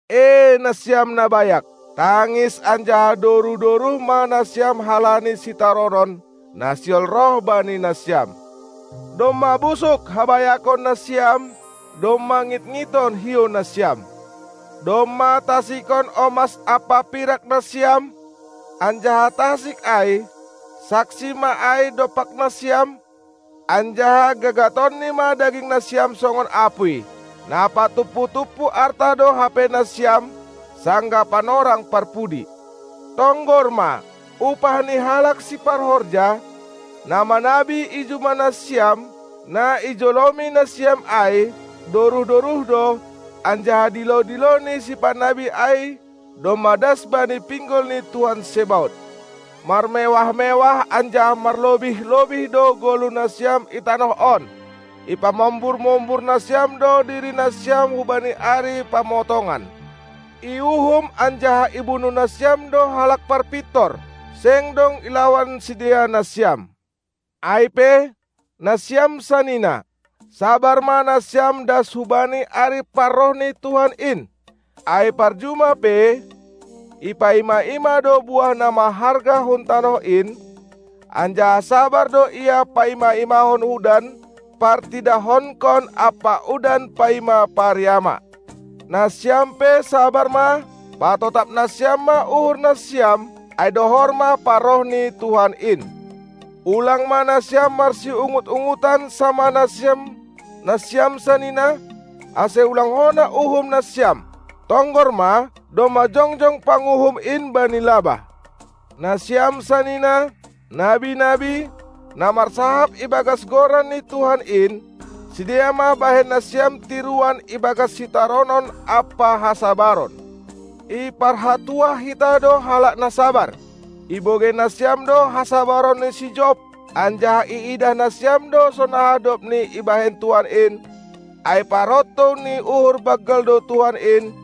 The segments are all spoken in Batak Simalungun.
Ee nasiam na bayak, tangis anjaha doruh-doruh ma nasiam halani sitaronon, na sihol roh bani nasiam. Domma busuk habayakon nasiam, domma ngitngiton hiou nasiam. Domma tasikon omas ampa pirak nasiam, anjaha tasik ai, saksi ma ai dompak nasiam, anjaha gagatonni ma daging nasiam songon apuy. Na patumpu-tumpu arta do hape nasiam sanggah panorang parpudi. Tonggor ma, upah ni halak siparhorja, na manabi i juma nasiam, na ijolomi nasiam ai, doruh-doruh do, anjaha dilo-dilo ni sipanabi ai domma das bani pinggol ni Tuhan Zebaot. Marmewah-mewah anjaha marlobih-lobih do goluh nasiam i tanoh on. Ipamombur-mombur nasiam do diri nasiam hubani ari pamotongan. Iuhum anjaha ibunuh nasiam do halak parpintor; seng dong ilawan sidea nasiam. Ai pe, nasiam sanina, sabar ma nasiam das hubani ari parroh ni Tuhan in! Ai parjuma pe, ipaima-ima do buah na maharga hun tanoh in, anjaha sabar do ia paima-imahon udan partidahonkon ampa udan paima pariama. Nasiam pe sabar ma, patotap nasiam ma uhur nasiam, ai dohor ma parroh ni Tuhan in. Ulang ma nasiam marsiungut-ungutan samah nasiam, nasiam sanina, ase ulang hona uhum nasiam. Tonggor ma, domma jongjong Panguhum in bani labah. Nasiam sanina, nabi-nabi, na marsahap ibagas Goran ni Tuhan in, sidea ma bahen nasiam tiruan ibagas sitaronon ampa hasabaron. Iparhatuah hita do halak na sabar. Ibogei nasiam do hasabaron ni si Job, anjaha iidah nasiam do sonaha dobni ibahen Tuhan in, ai parontou ni uhur banggal do Tuhan in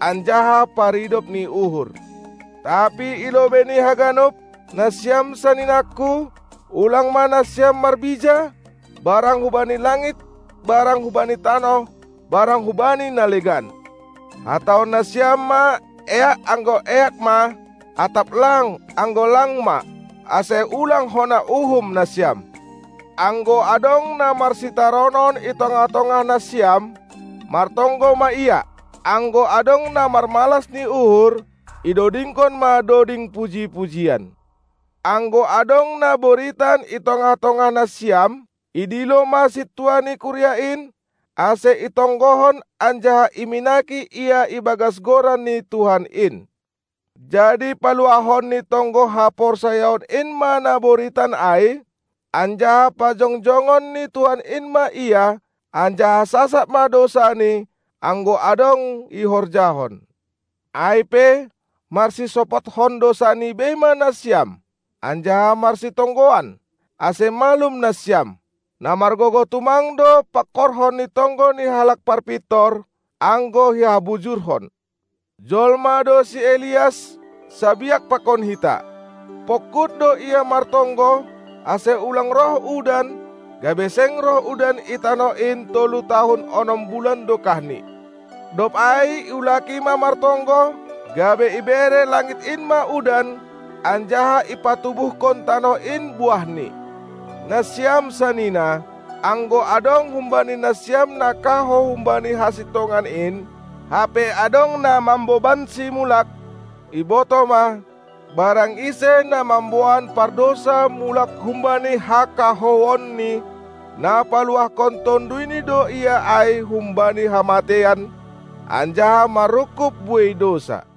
anjaha paridop ni uhur. Tapi i lobei ni haganup, nasiam saninangku, ulang ma nasiam marbija, barang hubani langit barang hubani tanoh barang hubani na legan. Hatahon nasiam ma: "Eak" anggo eak ma, atap "Lang," anggo lang ma, ase ulang hona uhum nasiam. Anggo adong na marsitaronon i tongah-tongah nasiam, martonggo ma ia. Anggo adong na marmalas ni uhur, idodingkon ma doding puji-pujian. Anggo adong na boritan i tongah-tongah nasiam, idilo ma sintua ni kuria in, ase itonggohon anjaha iminaki ia ibagas goran ni Tuhan in. Jadi paluahon ni tonggo haporsayaon in ma na boritan ai, anjaha pajongjongon ni Tuhan in ma ia; anjaha sasap ma dousani, anggo adong ihorjahon. Ai pe, marsisopothon dousani bei ma nasiam anjaha marsitonggoan, ase malum nasiam. Na margogoh tumang do pangkorhon ni tonggo ni halak parpintor, anggo ihabujurhon. Jolma do si Elias, sabiak pakon hita; pongkut do ia martonggo, ase ulang roh udan, gabe seng roh udan i tanoh in tolu tahun onom bulan dokahni. Dob ai iulaki ma martonggo, gabe ibere langit in ma udan, anjaha ipantubuhkon tanoh in buahni. Nasiam sanina, anggo adong humbani nasiam na kahou humbani hasintongan in, hape adong na mambobansi mulak, ibotoh ma: Barang ise na mamboan pardousa mulak humbani hakahouonni, na paluahkon tonduyni do ia ai humbani hamateian anjaha manrungkub buei dousa.